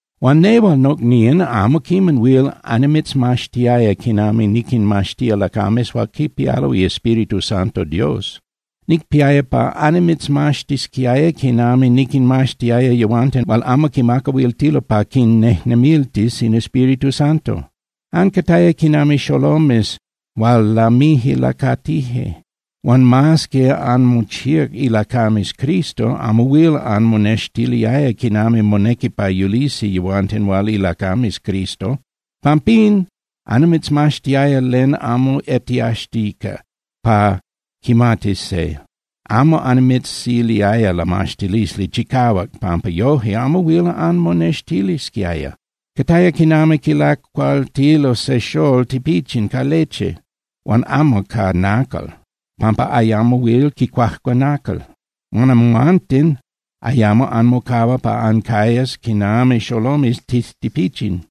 Huan nehual, nocnían, amo quiman huil annimitzmaxtiaya quinami niquinmaxtía lacames hual quipialo iEspíritu Santo Dios. Nicpiaya pa annimitzmaxtisquiaya quinami niquinmaxtiaya yehuanten hual amo quimacahuiltilo pa quinnejnemiltis in Espíritu Santo. Ancataya quinami xolomes hual lamije lacatije. Huan mas que anmochíac ilacames Cristo, amo huil anmonextiliaya quinami monequi pa yulisi yehuanten hual ilacames Cristo. Pampín annimitzmaxtiaya len amo etiaxtica pa quimatis se, amo annimitziliaya lamaxtilisli chicahuac pampa yoje amo huil anmonextilisquiaya. Cataya quinami quilacualtilo se xolol tipichin ca leche huan amo ca nacal, pampa ayamo huil quicuajcua nacal. Huan amhuanten ayamo anmocahua pa ancayas quinami xolomes tijtipichin,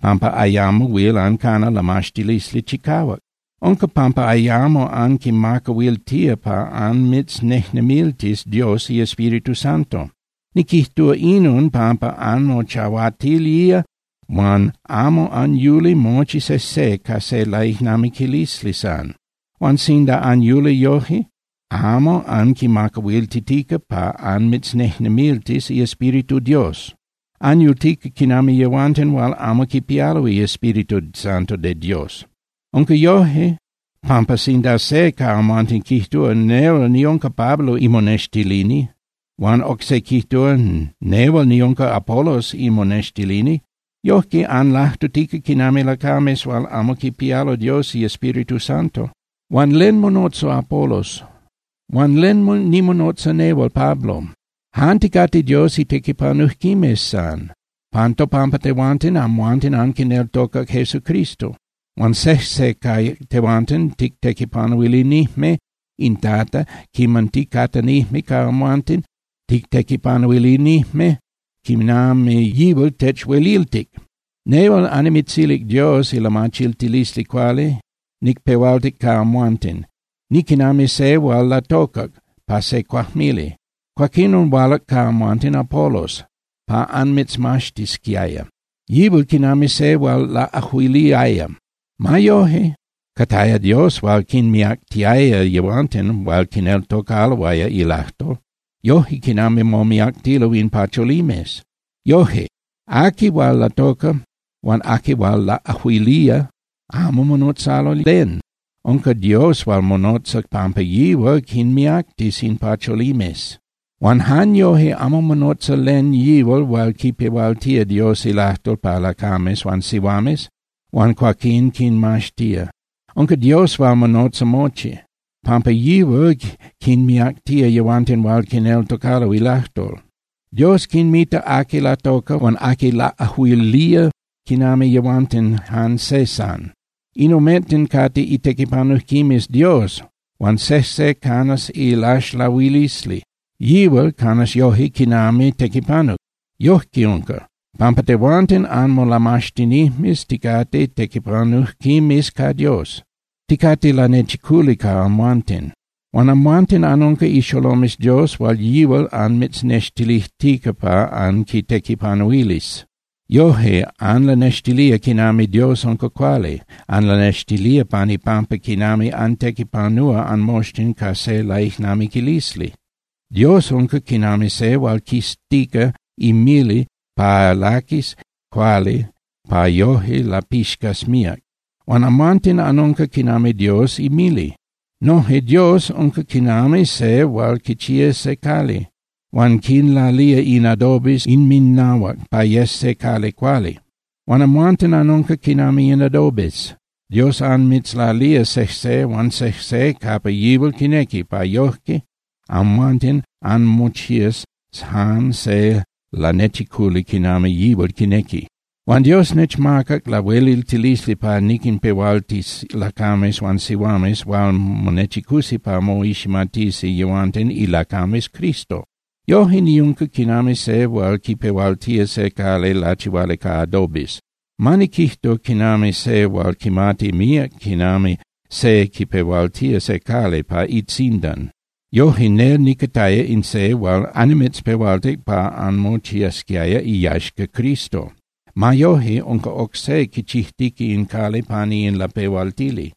pampa ayamo huil ancana lamaxtilisli chicahuac. Unca pampa ayamo anquimacahuiltía pa anmitznejnemiltis Dios iEspíritu Santo. Niquijtúa inon pampa anmochahuatilía huan amo anyuli mochi sejse ca se laijnamiquilisli san. Huan sinda anyuli yoje, amo anquimacahuiltitica pa anmitznejnemiltis iEspíritu Dios. Anyultica quinami yehuanten hual amo quipialo iEspíritu Santo de Dios. Unca yoje, pampa sinda se ca amhuanten quijtúa: “Nehual niunca Pablo imonextilini”, huan oc se quijtúa: “Nehual niunca Apolos imonextilini”, yoje anlajtutica quinami lacames hual amo quipialo Dios iEspíritu Santo. Huan ¿len monotza Apolos? Huan ¿len nimonotza nehual Pablo? Jan ticate Dios itequipanujquimes san. Pan topampa tehuanten, amhuanten anquineltocac Jesucristo. Huan sejse ca tehuanten tictequipanuilinijme in Tata quiman ticatanijme ca amhuanten, tictequipanuilinijme quinami yihual techhueliltic. Nehual annimitzilic Dios ilamachiltilisli cuali, nicpehualtic ca amhuanten, niquinami se hual latocac pa se cuajmili. Cuaquinon hualac ca amhuanten Apolos pa anmitzmaxtisquiaya, yihual quinami se hual laꞌajuiliaya. Ma yoje, cataya Dios hual quinmiactiaya yehuanten hual quineltocaloaya ilajtol, yoje quinami momiactilo in pacholimes. Yoje, aqui hual latoca huan aqui hual laꞌajuilía amo monotzalo len, unca Dios hual monotza pampa yihual quinmiactis in pacholimes. Huan jan yoje amo monotza len yihual hual quipehualtía Dios ilajtol pa lacames huan sihuames huan cuaquín quinmaxtía. Unca Dios hual monotza mochi, pampa yihual quinmiactía yehuanten hual quineltocalo ilajtol. Dios quinmita aqui latoca huan aqui laꞌajuilía quinami yehuanten jan se san. In omenten cate itequipanujquimes Dios huan sejse canas ilaxlahuilisli, yihual canas yoje quinami tequipanuc. Yojque unca, pampa tehuanten anmolamaxtinijmes ticate tequipanujquimes ca Dios, ticate lanechiculi ca amhuanten. Huan amhuanten anunca ixolomes Dios hual yihual anmitznextilijtica pa anquitequipanuilis. Yoje anlanextilía quinami Dios unca cuali, anlanextilía pan ipampa quinami antequipanúa anmoxtin ca se laijnamiquilisli. Dios unca quinami se hual quiztica imili pa laquis cuali pa yoje lapixcas míac, huan amhuanten anunca quinami Dios imili. Noje Dios unca quinami se hual quichía se cali, huan quinlalía in adobes inminnahuac pa yes se cali cuali. Huan amhuanten anunca quinami in adobes, Dios anmitzlalía sejse huan sejse capa yihual quinequi, pa yoje amhuanten anmochías jan se lanechiculi quinami yihual quinequi. Huan Dios nechmacac lahueliltilisli pa niquinpehualtis lacames huan sihuames hual monechicusi pa moiximatisi yehuanten ilacames Cristo. Yoje niunca quinami se hual quipehualtía se cali lachihuali ca adobes, ma niquijtu quinami se hual quimati míac quinami se quipehualtía se cali pa itzindan. Yoje nel nicataya in se hual annimitzpehualtic pa anmochiasquiaya iyaxca Cristo. Ma yoje, unca oc se quichijtica in cali pani in lapehualtili.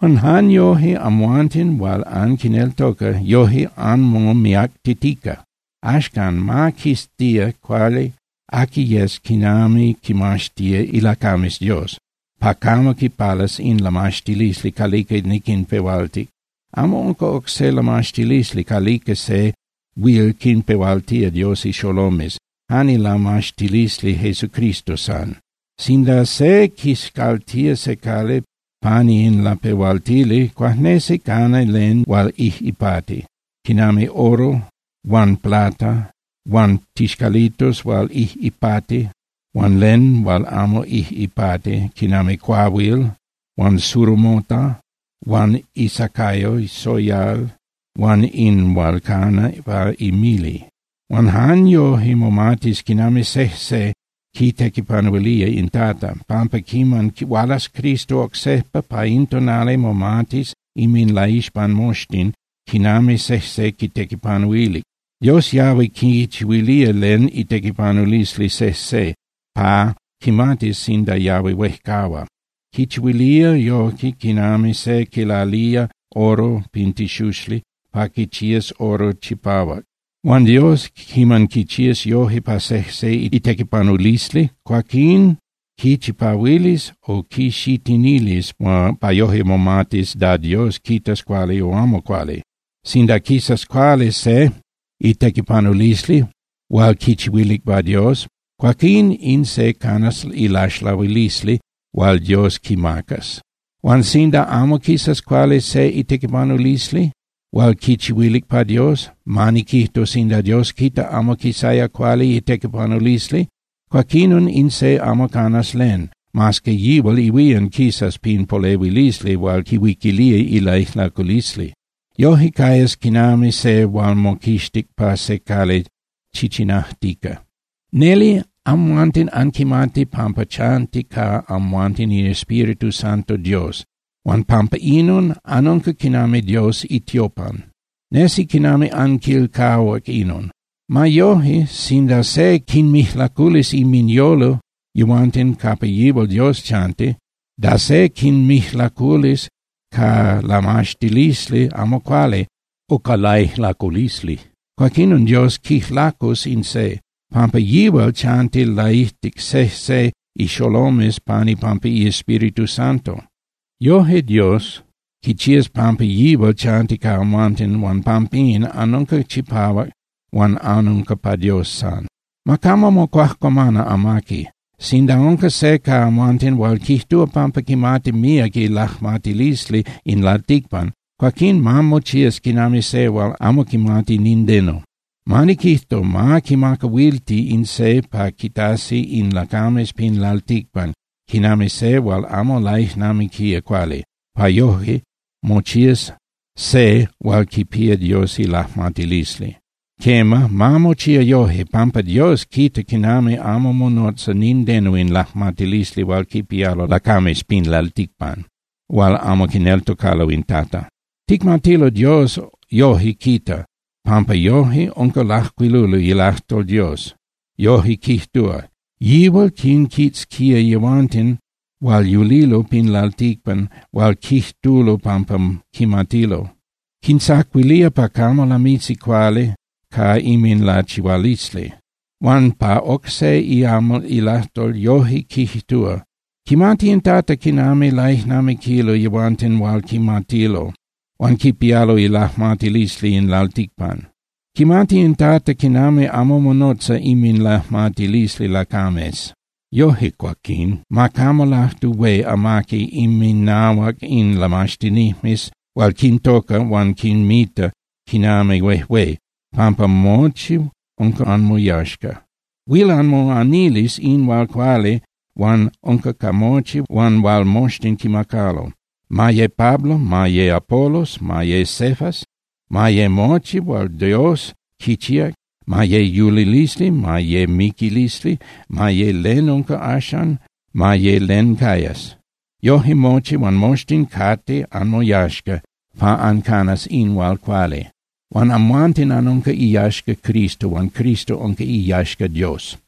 Huan jan yoje, amhuanten hual anquineltoca, yoje anmomiactitica. Axcan, ma quiztía cuali aqui yes quinami quinmaxtía ilacames Dios pa camo quipalas in lamaxtilisli calica niquinpehualtic. Amo unca oc se lamaxtilisli calica se huil quinpehualtía Dios ixolomes, jan ilamaxtilisli Jesucristo san. Sinda se quiscaltía se cali pani in lapehualtili, cuajnesi cana len hual ijꞌipati, quinami oro huan plata huan tixcalitos hual ijꞌipati, huan len hual amo ijꞌipati quinami cuahuil huan surumota huan isacayo soyal huan in hual cana pa imili. Huan jan yoje momatis quinami sejse quitequipanuilía in Tata, pampa quiman hualas Cristo oc sejpa, pa in tonali momatis inminlaixpan moxtin quinami sejse quitequipanuilic. Dios yahui quichihuilía len itequipanulisli sejse, pa quimatis sinda yahui huejcahua. Quichihuilía yoje quinami se quilalía oro pin tixuxli pa quichías oro chipahuac. Huan Dios, quiman quichías yoje pa sejse itequipanulisli, cuaquín quichipahuilis o quixitinilis pa yoje momatis da Dios quitas cuali o amo cuali. Sinda quisas cuali se itequipanulisli hual quichihuilic pa Dios, cuaquín in se canas ilaxlahuilisli hual Dios quimacas. Huan sinda amo quisas cuali se itequipanulisli hual quichihuilic pa Dios, ma niquijtu, sinda Dios quita amo quisaya cuali itequipanulisli, cuaquinon in se amo canas len, mas que yihual ihuían quisas pin polehuilisli hual quihuiquilía ilaijlaculisli. Yoje cayas quinami se hual moquixtic pa se cali chichinajtica. Neli amhuanten anquimati pampa chanti ca amhuanten iEspíritu Santo Dios, huan pampa inon, anunca quinami Dios itiopan. Nesi quinami anquilcahuac inon. Ma yoje, sinda se quinmijlaculis inminyolo yehuanten capa yihual Dios chanti, da se quinmijlaculis ca lamaxtilisli amo cuali o ca laijlaculisli, cuaquinon Dios quijlacus in se, pampa yihual chanti laijtic sejse ixolomes pan ipampa iEspíritu Santo. Yoje Dios quichías pampa yihual chanti ca amhuanten huan pampín, anunca chipahuac huan anunca pa Dios san. Ma camo mocuajcuamana amaqui. Sinda unca se ca amhuanten hual quijtúa pampa quimati míac ilajmatilisli in lalticpan, cuaquín ma mochías quinami se hual amo quimati nindeno. Ma niquijtu, ma quimacahuilti in se pa quitasi in lacames pin lalticpan quinami se hual amo laijnamiquía cuali, pa yoje mochías se hual quipía Dios ilajmatilisli. Quema, ma mochía yoje, pampa Dios quita quinami amo monotza nindeno in lajmatilisli hual quipialo lacames pin lalticpan hual amo quineltocalo in Tata. Ticmatilo Dios yoje quita, pampa yoje unca lajcuiluli ilajtol Dios, yoje quijtúa: “Yihual quinquitzquía yehuanten hual yulilo pin lalticpan hual quijtulo pampa quimatilo. Quintzacuilía pa camo lamisi cuali ca inminlachihualisli.” Huan pa oc se iamal ilajtol yoje quijtúa: “Quimati in Tata quinami laijnamiquilo yehuanten hual quimatilo, hual quipialo ilajmatilisli in lalticpan. Quimati in Tata quinami amo monotza inminlajmatilisli lacames.” Yoje cuaquín, ma camo lajtu hué amaqui inminahuac in lamaxtinijmes hual quintoca huan quinmita quinami huejué, pampa mochi unca anmoyaxca. Huil anmoanilis in hual cuali hual unca ca mochi huan hual moxtin quimacalo, ma ye Pablo, ma ye Apolos, ma ye Cefas, ma ye mochi hual Dios quichíac, ma ye yulilisli, ma ye miquilisli, ma ye len unca axan, ma ye len cayas. Yoje mochi huan moxtin cate anmoyaxca pa ancanas in hual cuali. Huan amhuanten anunca iyaxca Cristo. Huan Cristo unca iyaxca Dios.